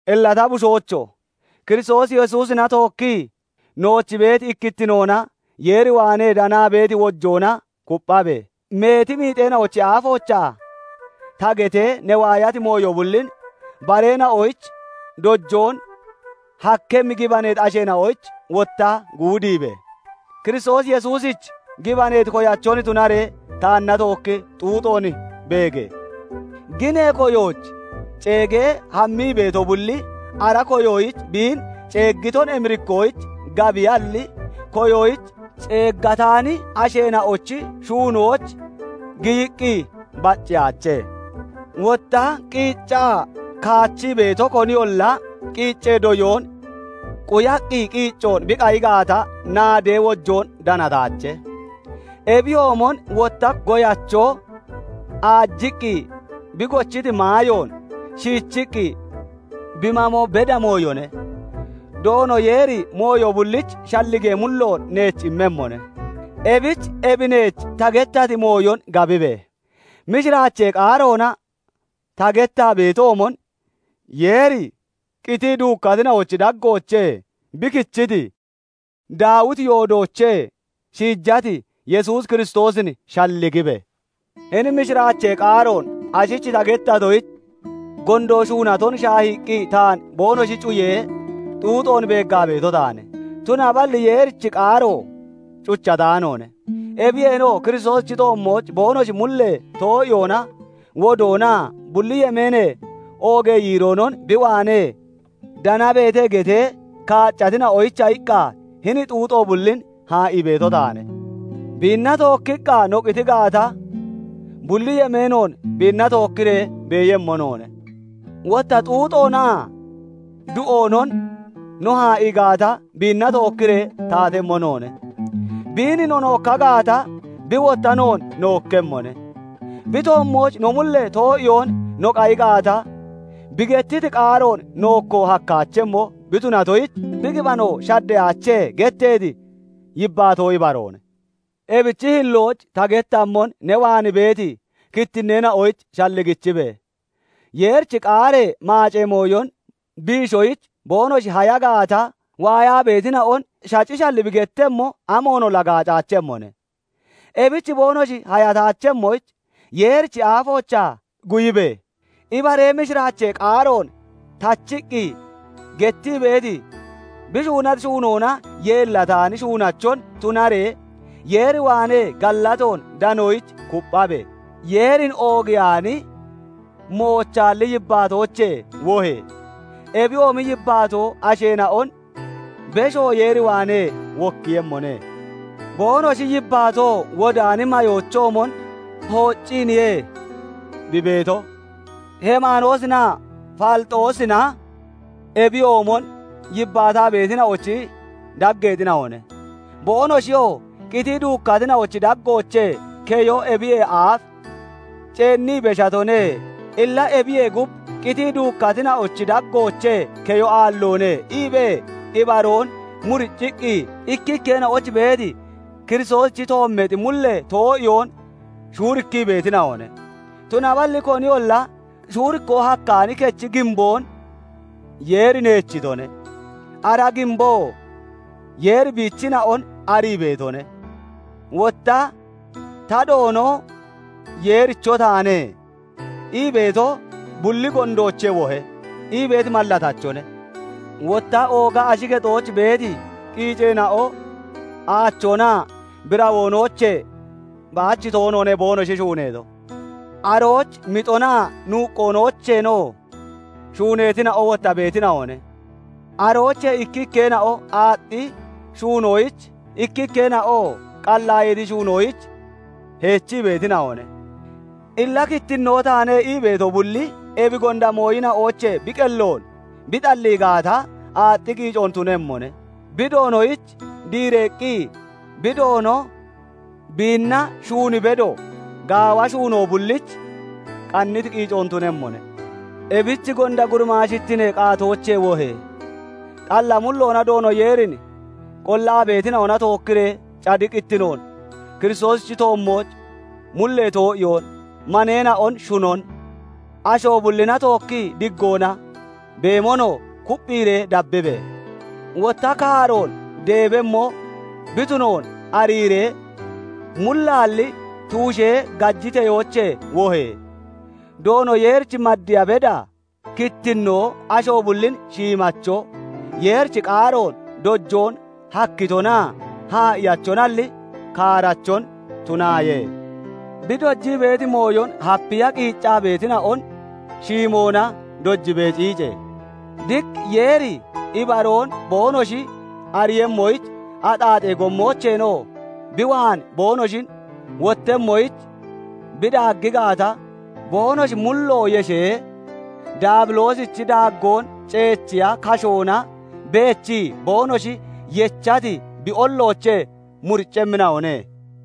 Illa ta bushoocho! Kiristoos Yesuusina tookkii nooch beeti ikkittinoona Yeer waanee danaa beeti wojoona kupphabe! Meeti miixeena'ochi aafoochaa ta getee ne waayati mooyo bullin, bareena'oyich dojoon hakkemmi gibaneeti asheena'oyich wotta guudiibe! Kiristoos Yesuusich gibaneeti koyachon tunaree taanna tookki xuuxoon beege! Ginee koyooch ceegee hammii beeto bulli ara koyoyich biin ceeggiton emirikkoyich gabiyalli, koyoyich ceeggataani asheena'ochi shuunooch giyiqqi bacceyaache. Wotta qiiccaa kaachii beeto koniyolla qiiccee doyoon quyaqqi qiicco bi qayi gaata, naaddee wojoon danataache. Ebiyoomon wotta goyacho aajiqqi bi gochiti maayoon shiichiqqi bi mamo beda mooyone. Doono Yeeri mooyo bullich shalligee mulloon neech immemmone; ebich ebi neech ta gettati mooyon gabibe! Mishiraachee qaaroona ta gettaa beetoomon, Yeeri qitii duukkatina'ochi daggoochee bi kichiti, Daawiti yoodoochee shiijati Yesuus Kiristoosin shalligibe! Hini mishiraachee qaaroon ashich ta gettatoyich, gondo shuunaton shaahiiqqi taan boonoshi cuyee, xuuxoon beeggaa beeto taane; tunaballi Yeerichi qaaro cuchataanoone. Ebiyeenoo Kiristoosichi toommooch boonoshi mullee too'iyoona wodoonaa bulli yemeenee oogee yiiroonon bi waanee danabeete getee kaaccatina'oyicha iqqa hini xuuxo bullin haa'ii beeto taane. "Biinna tookkiqqa no qiti gaata, Bulli yemeenoon biinna tookkiree beeyemmo noone; Wotta xuuxoonaa du'oonon no haa'ii gaata, Biinna tookkiree taatemmo noone; Biin no nookka gaata, Bi wotta noon nookkemmone; Bi toommooch no mullee too'iyoon no qayi gaata, Bi gettiti qaaroon nookko hakkaachemmo bi tunatoyich, Bi gibaneyoo shaddeyaache" getteeti yibbaatoo ibaroone. Ebichi hillooch ta gettammon ne waan beeti kittinneena'oyich shalligichibe! Yeerichi qaaree maacee mooyon biishoyich boonoshi haya (naba) gaata waayaa beetina'on shacishalli bi gettemmo, amoonolla gaacaachemmone; ebich boonoshi hayataachemmoyich, Yeerichi aafoochaa guyibe! Ibaree mishiraachee qaaroon tachiqqi gettii beeti, bi shuunati shuunoona yeellataani shuunachon tunaree, Yeer waanee gallatoon danoyich kupphabe! Yeerin oogiyaani, moochaalli yibbaatoochee wohe! Ebiyoomi yibbaatoo asheena'on beshoon Yeer waanee wokkiiyemmone; boonoshi yibbaatoo wodaani mayoochoomon hoocciiniye bi beeto. Heemanoosinaa Faliixoosina ebiyoomon yibbaataa beetina'ochi daggeexina'one. Boonoshiyoo "Qitii duukkatina'ochi daggoochee keyo ebiyee aaf ceennii beshatone; illa ebiyee gub qitii duukkatina'ochi daggoochee keyo aalloone" iibee ibaroon muricciqqi, ikkikkeena'oyich beeti Kiristoosichi toommeexi mullee too'iyoon shuurikkii beetina'one. Tunaballi koniyolla shuurikkoo hakkaani kechi giimboon Yeeri neechitone; ara giimboo "Yeeri biichina'on arii beetone", wotta " 'Ta, Doono Yeericho taane' " ii beeto bulli gondoochee wohe!" ii beeti mallatachone. Wotta ooga ashi kexooch beeti qiiceena'o aachoonaa birawoonoochee baach toonoone boonoshi shuuneeto; arooch mixonaa nuuqqoonoocheenoo shuuneetina'o wotta beetina'one; aroochee ikkikkeena'o aaxxi shuunoyich, ikkikkeena'oo qallaayeeti shuunoyich heechii beetina'one. Illa "Kittinnoo taane" ii beeto bulli ebi gonda mooyina'oochee bi qelloon bi xallii gaata, aaxxi qiicoon tunemmone; bi Doonoyich diireeqqi bi Doono biinna shuun bedo, gaawa shuunoo bullich qanniti qiicoon tunemmone. Ebich gonda gurimaashittinee qaatoochee wohe! Xalla mulloona Doono Yeerin qollaa beetina'ona tookkiree cadiqittinoon, Kiristoosichi toommooch mullee too'iyoon, maneena'on shunon, asho bullina tookki diggoona beemonoo kupphiiree dabbibe! Wotta kaaroon deebemmo bi tunoon ariiree mullaalli tuushee gajiteyoochee wohe! Doono Yeerich maddiya beda kittinnoo, asho bullin shiimacho, Yeerichi qaaroon dojoon hakkitonaa haa'iyachonalli, kaarachon tunaaye. Bi dojii beeti mooyon hapiya qiiccaa beetina'on shiimoona dojibee ciice. Diq Yeeri ibaroon boonoshi ariiyemmoyich, axaaxee gommoocheenoo bi waan boonoshi wottemmoyich bi daaggi gaata, boonoshi mullo yeshee, Daabiloosichi daaggoon ceechiya kashoona beechii boonoshi yechati bi olloochee muriccemmina'one.